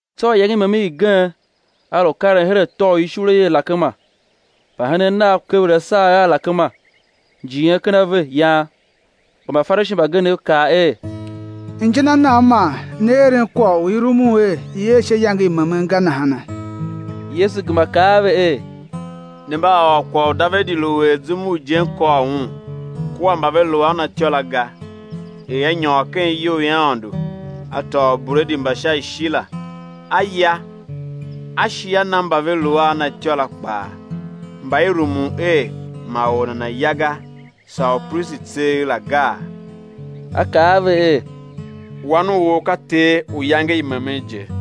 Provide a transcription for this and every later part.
Tsô iyange i memen igen A lu karen her atô u ishule i alakema, mbahenen Nav lu kever asagher a alakema, njighen ken ave, yan. Kpa Mbafarishi mbagenev kaa er: Inja na nan man ne eren kwagh u i rumun er i̱ er sha iyange i memen ga nahana? Yesu gema kaa a ve er: Ne mba a ôr kwagh u Davidi lu er zum u ijen kôr un, kua mba ve lu a na ityô la ga, er a nyôr ken iyou i Aôndo, a tôô ubredi mba sha ishi la, a ya, a shi a na mba ve lu a na ityô la kpaa, mba i rumun er ma or nana̱ ya ga, saa upristi tseegh la gaa? A kaa a ve er: Wan u or ka Ter u iyange i memen je.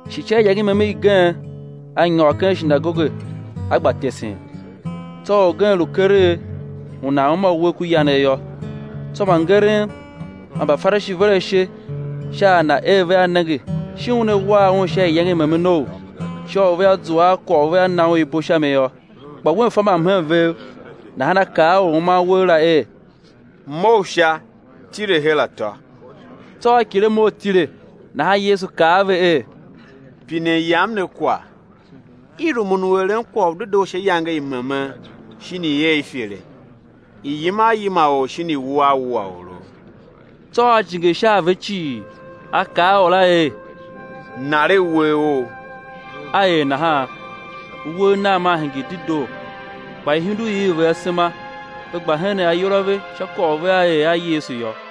Shi sha iyange i memen igen A nyôr ken shinagoge, A gba tesen. Tsô orgen lu keregh, u nan uma uwegh ku yanegh yô. Tsô mbangeren man Mbafarishi ver ashe sha a Na er vea nenge shin Una war un sha iyange i memenou, sha u vea zua a kwagh u vea na un ibo sha mi yô. Kpa Wen fa mbamhen vev, nahan A kaa a or u uman uwegh la er: Mough sha, tile her atô. Tsô a kighir a mough a tile. Nahan Yesu kaa a ve er: Pinen Yam ne kwagh, i rumun u eren kwagh u dedoo sha iyange i memen, shin i̱ er ifere, i̱ yima a yima or shin i̱ wua a wua oro? Tsô A jinge sha a ve cii, A kaa a or la er: Naregh uwegh ough. A er nahan. Uwegh nagh maa hingir dedoo. Kpa ihundugh iv ve asema, ve gba henen ayol a ve sha kwagh u vea er a Yesu yô.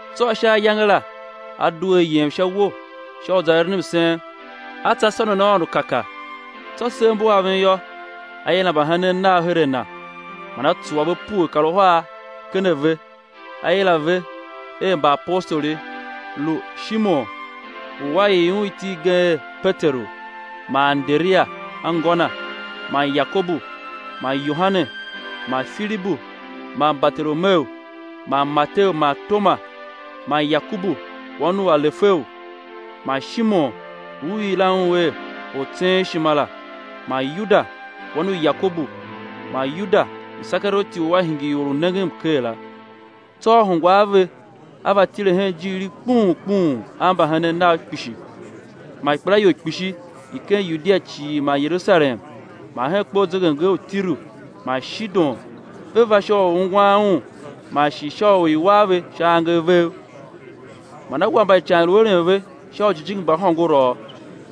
Tsô sha ayange la, A due A yem sha uwo sha u za eren msen; A tsa sônon Aôndo kaka. Tsô sev mbu aven yô, A yila mbahenen Nav her a Na, man A tsuwa pue kar uhar ken a ve, A yila ve er Mbaapostoli, lu: Shimon, u A ii un iti igen er Peteru, man Anderia, anngô na, man Yakobu man Yohane, man Filibu man Bartolomeu, man Mateu man Toma, man Yakobu wan u Alefeu, man Shimon u i yilan un er Ortseenshima la; man Yuda wan u Yakobu, man Yuda Isekarioti u a hingir or u nengen mker la. Tsô A hungwa a ve, A va tile hen ijiir i kpuun kpuun a mbahenen Nav kpishi man ikpelaior kpishi i ken Yudia cii man Yerusalem man hen kpe u zegemnger u Tiru man Shidon; ve va sha u ungwan Un man shi sha u i̱ war ve sha angev vev. Man A war mba ican i lu eren ve sha ujijingi mba hôngorouv.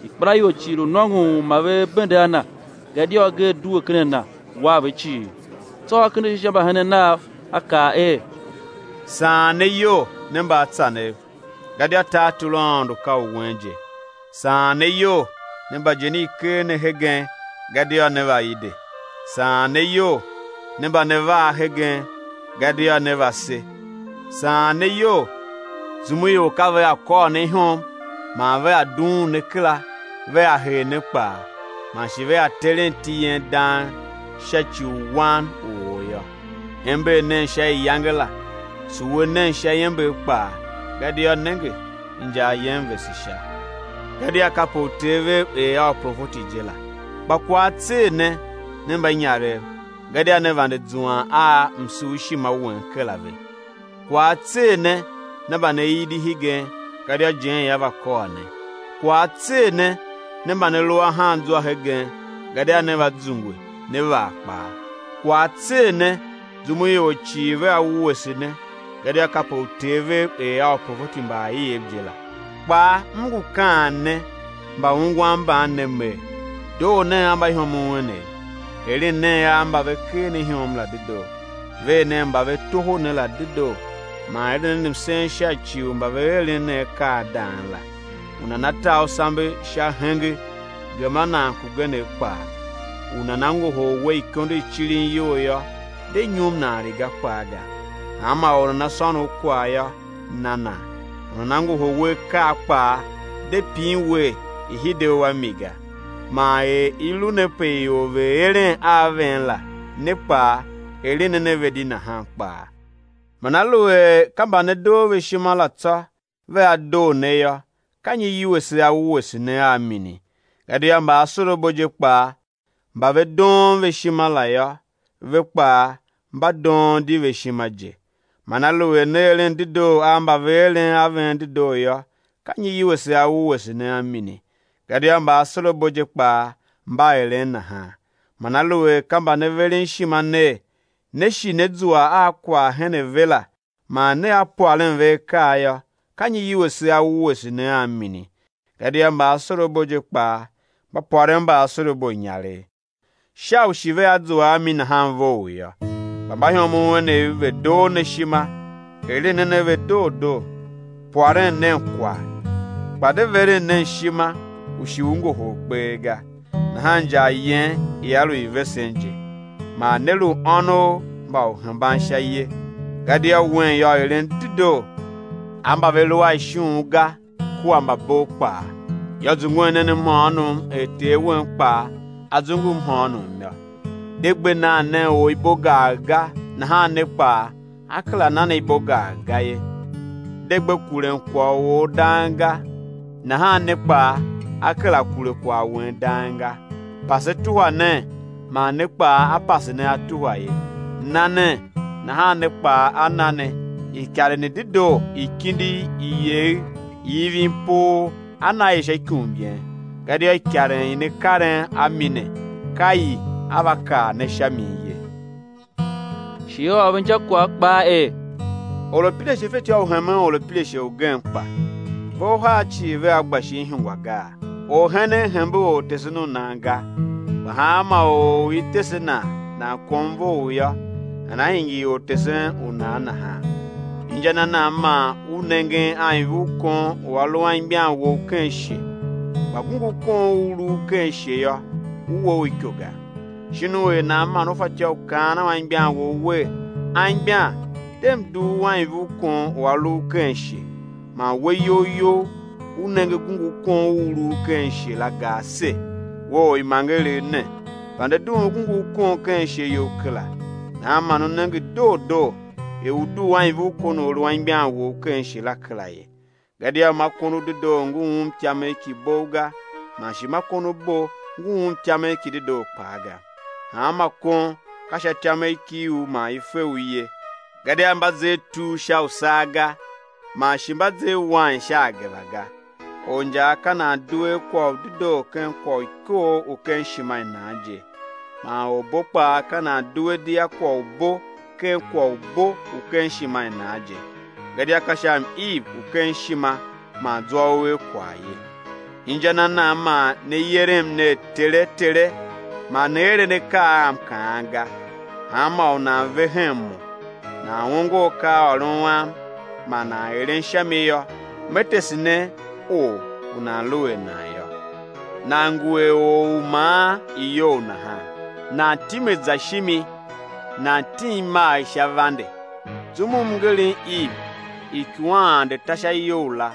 Ikpelaior cii lu nôngon u ma ve bende a Na, gadia agee due ken a Na, war ve cii. Tsô A kende ashe sha mbahenen Nav, A kaa er: Saan ne iyol, ne mbaatsanev, gadia tartor u Aôndo ka u wen je. Saan ne iyol, ne mba ijen i ker ne hegen, gadia né va ide. Saan ne iyol, ne mba ne vaa hegen, gadia né va se. Saan ne iyol zum u ior ka vea kôr ne ihom, man vea dughun ne kera, vea hee ne kpaa, man shi vea teren iti yen dang, sha ci u Wan u ôr yô. Ember nen sha iyange la, tsuwe nen sha iember kpaa, gadia nenge, injar yen vese Sha; gadia kape uter vev er a uprofeti je la. Kpa kwagh á tser ne, ne mbanyarev, gadia ne vande zuan a msurshima wen kera ve. Kwagh á tser ne, ne mba ne idi hegen, gadia ijen ia va kôr ne. Kwagh á tser ne ne mba ne lu ahan zwa hegen, gadia né va zungwe né vaa kpaa. Kwagh á tser ne zum u ior cii vea wuese ne, gadia kape uter vev er a uprofeti mba aiev je la. Kpaa M ngu kaan ne mbaungwan mban ne Mer, doo nen a mbaihomov enev, eren nen a mba ve ker ne ihom la dedoo; ver nen mba ve toho ne la dedoo; man eren nen msen sha ci u mba ve eren ne akaa a dang la. U nana ta u sambe sha henge, gema nan kugenegh kpaa; u nana ngohol we ikondo i cirin iyol yô, de nyum nan riga kpaa ga. Hanma or u nana sôn u kwagh yô, na nan; u nana ngohol we akaa kpaa, de pin wer i̱ hide u a mi ga. Man er i lu ne pe ior ve̱ eren a ven la, ne kpaa eren nen a ve di nahan kpaa. Man aluer ka mba ne doo ve ishima la tsô vea doo ne yô, ka nyi iwuese á wuese ne a mini? Gadia mbaasorabo je kpaa, mba ve doon ve ishima la yô, ve kpaa mba doon di ve ishima je. Man aluer ne eren dedoo a mba ve eren a ven dedoo yô, ka nyi iwuese á wuese ne a mini? Gadia mbaasorabo je kpaa mba eren nahan. Man aluer ka mba ne veren ishima ner, né shi né zua a kwagh hen a ve la, man nea pwaren ve akaa yô, ka nyi iwuese á wuese ne a mini? Gadia mbaasorabo je kpaa mba pwaren mbaasorabo inyaregh, sha u shi vea zua a mi nahan vough yô. Kpa mbaihomov enev ve̱ doo ne ishima, eren nen a ve doo doo, pwaren nen kwagh, kpa de veren nen ishima u shi ngohol kpee ga; nahan injar yen ia lu i vesen je, man né lu ônov mba Uhembansha ye; gadia Wen yô, eren dedoo a mba ve lu a ishughun ga kua mbabov kpaa. Yô, zungwen nen mhôônom er Ter wen kpaa A zungu mhôônom yô. De gbe nan nen or ibo gagh ga, nahan ne kpaa á kera na ne ibo gagh ga ye; de gbe kuren kwagh u or dang ga, nahan ne kpaa á kera kure kwagh wen dang ga, pase tuhwa nen, man ne kpaa á pase ne á tuhwa ye. Na nen, nahan ne kpaa á na ne; ikaren i dedoo, i kindigh, i yegher, i ivin poo, á na i sha ikum yen, gadia ikaren i ne karen a mi ne, ka i á va kar ne sha min ye. Shi A ôr ve injakwagh kpaa er: Orapirashe fatyô u hemen orapirashe ugen kpa? Ve uhar cii vea gba shin ihungwa gaa? Orhenen hembe ortesen u nan ga; kpa hanma or u i tese nan nan kom vough yô, nana hingir er ortesen u nan nahan. Inja na nan man u nengen anivurkon u a lu anmgbian wou ken ishe, kpa gungurkon u u lu u ken ishe yô, u we u iko ga? Shin u er nan man u fatyô u kaan a anmgbian wou wer: Anmgbian, de, m̱ dugh u anivurkon u a lu u ken ishe, man we iyol you, u nenge gungurkon u u lu u ken ishe la ga ase? We orimangeregh ne, vande dughun gungurkon ken ishe you kera, nahan man ú nenge doo doo er ú dugh anivurkon u a lu anmgbian wou ken ishe la kera ye. Gadia ma kon u dedoo ngu um ityamegh ki bogh ga; man shi ma kon u bo ngu um ityamegh ki dedoo kpaa ga. Hanma kon, ka sha ityamegh ki u man i fe u ye; gadia mba zer tur sha usaa ga, man shi mba zer wain sha ageva ga. Orinjaa ka nan due a kwagh u dedoo ken kwagh u ikoogh u ken ishima i nan je, man orbo kpaa ka nan due di a kwagh u bo ken kwagh u bo u ken ishima i nan je; gadia ka sha m-iv u ken ishima man zwa u er kwagh ye. Inja na nan man ne yerem ner, Tere! Tere! man ne eren akaa a M kaan ga? Hanmô u nan ve hen Mo, nan ongo akaaôron Am, man nan eren sha mi yô, Me tese ne or u nan lu er nan yô. Nan ngu er or u maan iyou nahan, nan time za shimi, nan tim imagh sha vande. Zum u mngerem iv, ikuwan ande ta sha iyou la,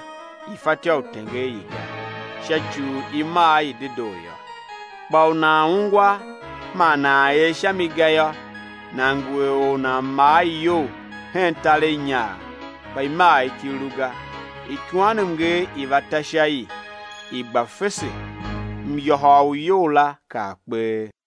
i fatyô u tenger i ga, sha ci u i maa i dedoo yô. Kpa u nan ungwa man nan er sha mi ga yô, nan ngu er or u nan maa iyou hen tareghnyaagh, kpa imagh ki lu ga. Ikuwanmnger i va ta sha i, i gba fese, myôhôr u iyou la kaa kpee.